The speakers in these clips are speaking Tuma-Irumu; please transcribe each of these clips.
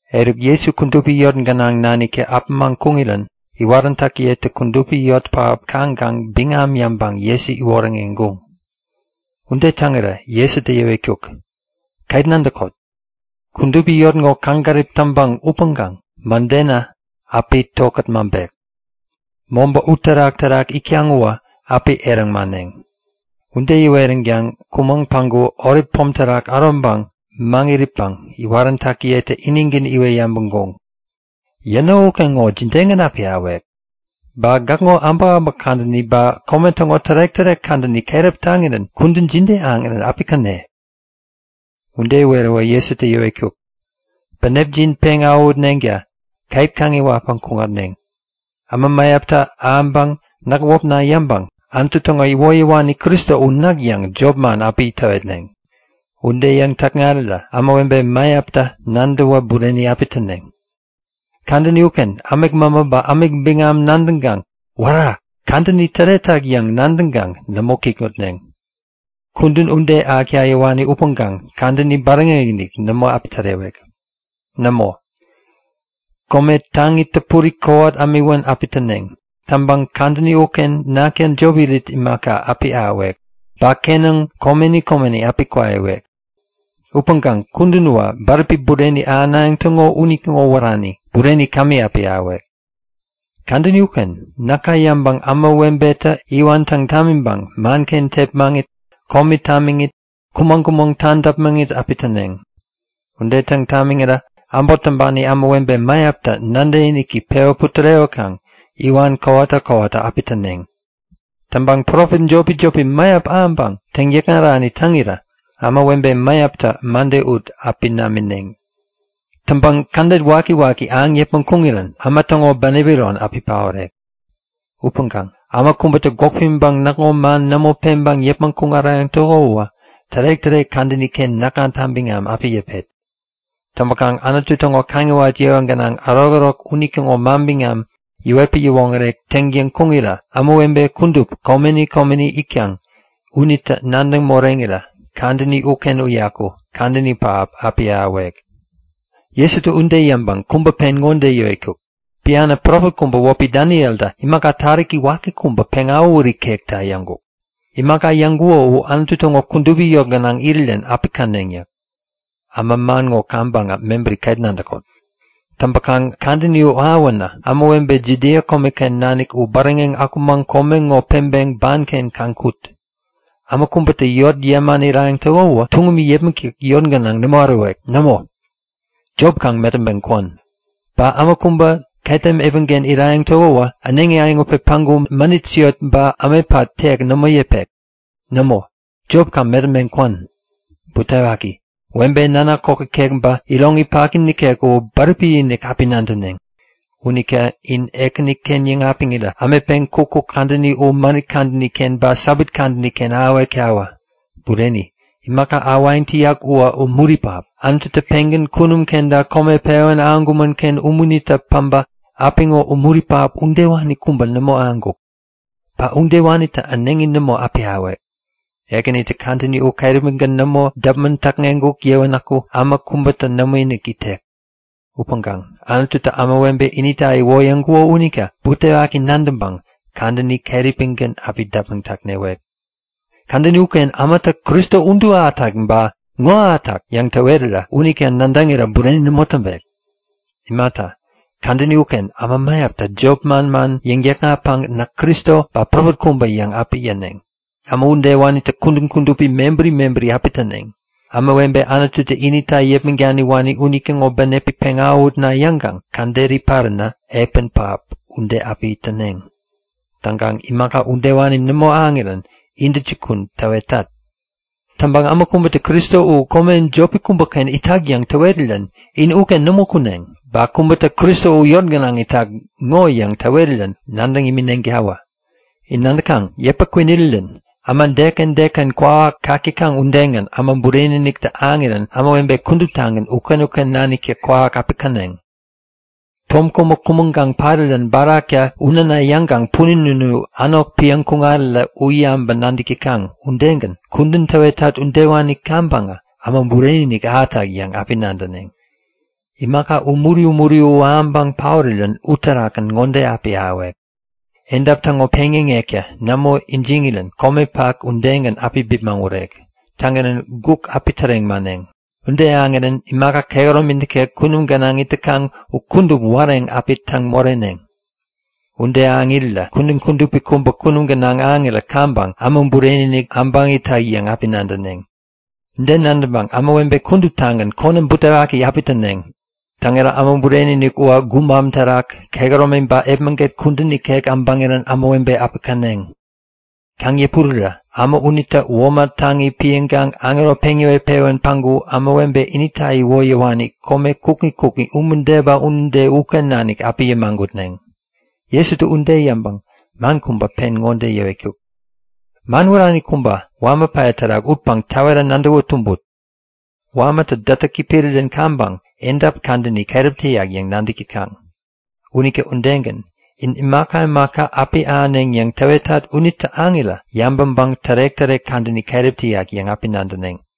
Eruk Jesu kudupi yot gänaŋ naniktä äpämaŋ kuŋirän iwaräntäkiyetä kudupi yot pähap kaŋkaŋ biŋam yäŋpäŋ Jesu iwoŋäreŋkuŋ. Ude täŋirä Jesutä yäwetkuk; Ket nadäkot! Kudupi yot ŋo kaŋgärip täkaŋ upäŋkaŋ mädenä api tokät mäŋpek. Mobä uterak-terak itkaŋ uwä api eräŋ mäneŋ. Ude yäweränkaŋ kumaŋ päŋku Olip pom terak äroŋpäŋ maŋit itpäŋ iwaräntäkiyetä inigän iwet yabäŋkuŋ; Yäno ukeŋowä jidegän api ahäwek? Ba gäkŋo äbäkäbäk kadäni ba kome täŋo tärek-tärek kadäni keräp taŋirän kudän jide ahäŋirän api käne? Ude iweräwä Jesutä yäwetkuk; Bänepjin peŋ awähutneŋta ket kaŋiwatpäŋ kuŋatneŋ. Äma mäyaptä ahäŋpäŋ näk wäpna yäŋpäŋ Anutu täŋo iwoyäwani Kristo u näk yäŋ jopman api täwetneŋ. Ude yäŋ-täkŋarirä ämawebe mäyaptä nadäwä bureni api täneŋ. Kadäni uken ämik mämä ba ämik biŋam nadäŋkaŋ Wära! Kadäni täretak yäŋ nadäŋkaŋ nämo kikŋutneŋ. Kudän ude ahäkta yäwani upäŋkaŋ kadäni bäräŋeŋ-inik nämo api tärewek. Nämo, kome taŋi täpuri kowat ämiwän api täneŋ. Täŋpäŋ kadäni uken nakta jop irit imaka api ahäwek. Ba kenäŋ komeni komeni api kwaiwek. Upäŋkaŋ kudän uwä bäräpi bureni ahänayäŋ täŋo unitäŋo wärani. Bureni kämi api ahäwek. Kadäni uken näka yäŋpäŋ ämawebetä iwan täŋ tamiŋpäŋ manken tepmaŋit, komi tamiŋit, kumäŋ-kumäŋ tadäpmäŋit api täneŋ. Ude täŋ tamiŋirä äbot täŋpani ämawebe mäyaptä nadäkiniki pewä putärewäkaŋ iwan kowata kowata api täneŋ. Täŋpäŋ profet jopi-jopi mäyap ahäŋpäŋ täŋyäkŋarani täŋirä ämawebe mäyaptä mäde api ut namineŋ. Täŋpäŋ kädet wakiwaki ahäŋ yäpmäŋ kuŋirän äma täŋo bänep iron api paorek. Upäŋkaŋ äma kubätä gwäk pimiŋpäŋ näkŋo man nämo peŋkaŋ yäpmäŋ kuŋarayäŋ täko uwä tärek-tärek kadäni-ken näkŋata biŋam api yäpet. Täŋpäkaŋ Anutu täŋo kaŋiwat yewa gänaŋ ärokärok unitäŋo manbiŋam yäwetpäŋ yäwoŋärek täŋtäŋ kuŋirä ämawebe kudup komeni komeni itkaŋ unitä nadäŋ moreŋirä kadäni uken uyaku kadäni pähap api ahäwek. Jesutä ude yäŋpäŋ kubä pen ŋode yäwetkuk; Bianä profet kubä wäpi Danieltä imaka taräki waki kubä peŋawähut ikekta yäŋkuk. Imaka yäŋkuko u Anutu täŋo kudupi yot gänaŋ irirän api käneŋ yäk. (Äma man ŋo kaŋpäŋä mebäri ket nadäkot.) Täŋpäkaŋ kadäni u ahäwänä ämawebe Judia komeken nanik u bäräŋeŋ akumaŋ kome ŋo peŋpeŋ banken kaŋ kut. Äma kubätä yot yäman irayäŋ täko uwä tuŋumi yäpmäkta yot gänaŋ nämo ärowek. Nämo, jop kaŋ metäŋpeŋ kwän! Ba äma kubä ketem epänken irayäŋ täko uwä äneŋi äyäŋutpeŋ päŋku mänit siot ba ämetpat tek nämo yäpek. Nämo, jop kaŋ metäŋpeŋ kwän! Butewaki! Webe nanak kok ikek ba iroŋi paki nikek u bäräpi-inik api nadäneŋ! Unita in Ekäniken yäŋapiŋirä ämetpeŋ kukkuk kadäni u mänit kadäni-ken ba Sabat kadäni-ken ahäwektawä! Bureni, imaka ahäwayäŋ täyak uwä umuri pähap. Anututä pengän kunum kenta kome pewän ahäŋkumän-ken umunitä päbä apiŋo umuri pähap udewani kubä nämo ahäŋkuk. Ba udewanitä äneŋi nämo api ahäwek. Ekänitä kadäni u keräpigän nämo däpmäŋ täkŋeŋkuk yäwänäku äma kubätä nämoinik itek. Upäŋkaŋ Anututä ämawebe inita iwoyäŋkuko unita butewaki nadäŋpäŋ kadäni keräpigän api däpmäŋ täkŋewek. Kadäni ukenä ämatä Kristo udu ahätak! ba ŋo ahätak! yäŋ täwerirä unita nadäŋirä bureni nämo täŋpek. Imata, kadäni uken äma mäyaptä jop manman yäŋ-täkŋatpäŋ näk Kristo ba profet kubä yäŋ api yäneŋ. Äma udewanitä kudän kudupi mebäri mebäri api täneŋ. Ämawebe Anututä inita yäpmäŋ daniwani unitäŋo bänepi peŋ awähutna yäŋkaŋ käderi paränä epän pähap ude api täneŋ. Täŋkaŋ imaka udewani nämo ahäŋirän intäjukun täwetat. Täŋpäŋ äma kubätä Kristo u kome jopi kubäken itak yäŋ täwerirän in uken nämo kuneŋ. Ba kubätä Kristo u yot gänaŋ itak ŋo yäŋ täwerirän u nadäŋ imineŋtawä. In nadäkaŋ? Yäpä kwinirirän äma deken deken kwawak kak täkaŋ udegän Äma Bureni-iniktä ahäŋirän ämawebe kuduptagän uken-uken naniktä kwawak api käneŋ. Tom kubä kumäŋkaŋ parirän baraktä u näna yäŋkaŋ punin unu änok piäŋ kuŋarirä u yabäŋpäŋ-nadäk täkaŋ. Udegän, kudän täwetat udewani kaŋpäŋä Äma Bureni-inik ahätak yäŋ api nadäneŋ. Imaka umuri umuri u ahäŋpäŋ paorirän uterakgän ŋode api ahäwek; Edap täŋo peŋyäŋektä nämo ijiŋirän, komepak udegän api bipmäŋ urek. Täŋirän guk api täreŋ mäneŋ. Ude ahäŋirän imaka kehäromi nikek kunum gänaŋ it täkaŋ u kudup wareŋ api täŋ moreneŋ. Ude ahäŋ irirä kudän kudupi kubä kunum gänaŋ ahäŋirän kaŋpäŋä Äma Bureni-inik äbäŋ itak yäŋ api nadäneŋ. Ude nadäŋpäŋ ämawebe kuduptagän konäm butewaki api täneŋ. Täŋirä Äma Bureni-inik uwä gubam terak, kehäromi ba epmäget kudän ikek äbäŋirän ämawebe api käneŋ. Kaŋ-yäpurirä äma unitä womat taŋi piäŋkaŋ aŋero peŋ yäwet-pewän päŋku ämawebe inita iwoyäwani kome kukŋi kukŋi, umude ba unude uken nanik api yämagutneŋ. Jesutä ude yäŋpäŋ man kubä pen ŋode yäwetkuk; Man wärani kubä wama päya terak utpäŋ täwera nadäwä tumbut. Wamatä dätäki pirirän kaŋpäŋ edap kadäni keräp täyak yäŋ nadäk täkaŋ. Unita udegän, in imaka imaka api ahäneŋ yäŋ täwetat unitä ahäŋirä yabäŋpäŋ tärek-tärek kadäni keräp täyak yäŋ api nadäneŋ.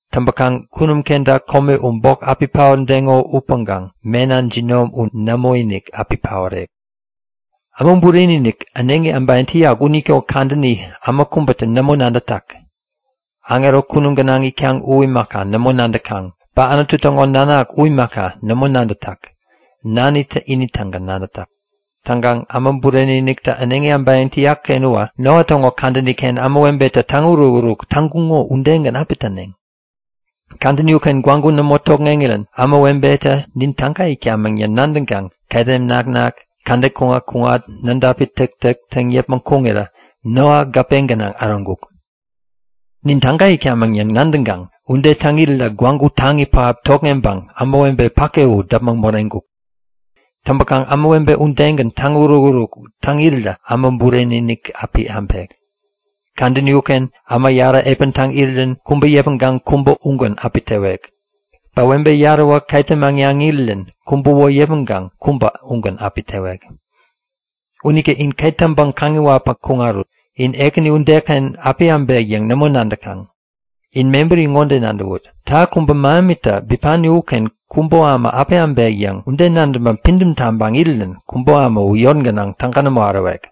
Täŋpäkaŋ kunum kenta kome u bok api paotdeŋo upäŋkaŋ mena jinom u nämoinik api paorek. Äma Bureni-inik äneŋi äbayäŋ täyak unitäŋo kadäni äma kubätä nämo nadätak. Aŋero kunum gänaŋ itkaŋ u imaka, nämo nadäkaŋ. Ba Anutu täŋo Nanak u imaka, nämo nadätak. Nanitä ini-tägän nadätak. Täŋkaŋ Äma Bureni-iniktä äneŋi äbayäŋ täyak-ken uwä Noa täŋo kadäni-ken ämawebetä täŋuruk-uruk täŋkuŋo udegän api täneŋ. Kadäni uken gwägu nämo tokŋeŋirän ämawebetä nin täga itkamäŋ yäŋ nadäŋkaŋ ketem naknak, kädet kuŋat-kuŋat, nädapi täktäk täŋ yäpmäŋ kuŋirä Noa gäpe gänaŋ äroŋkuk. Nin täga itkamäŋ yäŋ nadäŋkaŋ ude täŋ irirä gwägu taŋi pähap tokŋeŋpäŋ ämawebe päke u däpmäŋ moreŋkuk. Täŋpäkaŋ ämawebe udegän täŋuruk-uruk täŋ irirä Äma Bureni-inik api äbek. Kadäni uken äma yarä epän täŋ irirän kubä yäpmäŋkaŋ kubä ugän api tewek. Ba webe yaräwä ketem äŋnaŋ irirän kubäwä yäpmäŋkaŋ kubä ugän api tewek. Unita in ket täŋpäŋ kaŋiwatpäŋ kuŋarut. In Ekäni udeken api äbek yäŋ nämo nadäkaŋ. In mebäri ŋode nadäwut; Täha kubä mähemitä bipani uken kubo äma api äbek yäŋ, ude nadäŋpäŋ pidäm taŋpäŋ irirän kubo äma u yot gänaŋ täga nämo ärowek.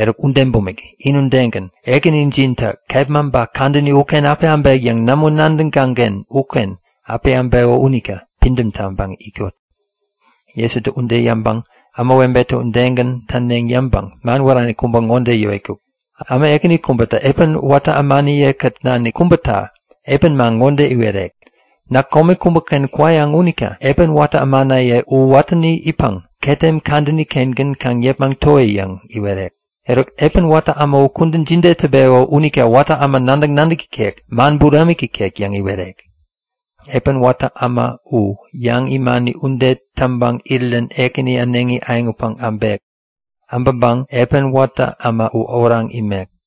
Eruk ude bumik, in udegän Ekänijintä kepma ba kadäni uken api äbek yäŋ nämo nadäkaŋ-ken uken api äbeko unita pidäm taŋpäŋ itkot. Jesutä ude yäŋpäŋ ämawebetä udegän täneŋ yäŋpäŋ man wärani kubä ŋode yäwetkuk; Äma ekäni kubätä epän watä ämaniye-kät nanik kubäta epän man ŋode iwerek; Näk kome kubäken kwayäŋ unita epän watä ämanaye u watäni itpäŋ ketem kadäni-kengän kaŋ yepmäŋ towi yäŋ iwerek. Eruk, epän watä äma u kudän jide täŋpeko unita watä äma nadäk-nadäk ikek, man buramik ikek yäŋ iwerek? Epän watä äma u, yäŋ imani ude täŋpäŋ irirän ekänini äneŋi äyäŋutpeŋ äbek. Äbäŋpäŋ epän watä äma u oraŋ imek.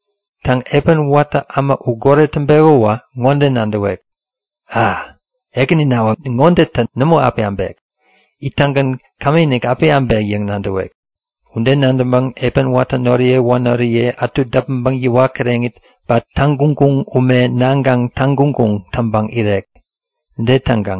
Täŋ, epän watä äma u goret täŋpeko uwä ŋode nadäwek; A! Ekäninawä ŋodetä nämo api äbek! Ittäŋgän kämiinik api äbek yäŋ nadäwek. Ude nadäŋpäŋ epän watä noriye wanoriye ätu däpmäŋpäŋ yäwat kireŋit, ba täŋguŋguŋ ume naŋkaŋ täŋguŋ taŋpäŋ irek. Ude täŋkaŋ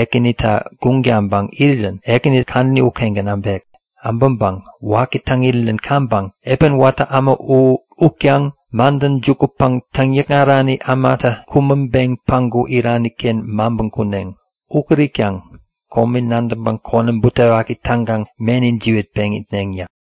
ekäninita guŋ taŋpäŋ irirän ekänitä kadäni ukengän äbek. Äbäŋpäŋ waki täŋ irirän kaŋpäŋ epän watä äma u utkaŋ madäŋ jukutpäŋ täŋyäkŋarani ämatä kumäŋpeŋ päŋku irani-ken maŋpän kuneŋ. Ukät itkaŋ komi nadäŋpäŋ konäm butewaki täŋkaŋ meni jiwätpeŋ itneŋ yäk.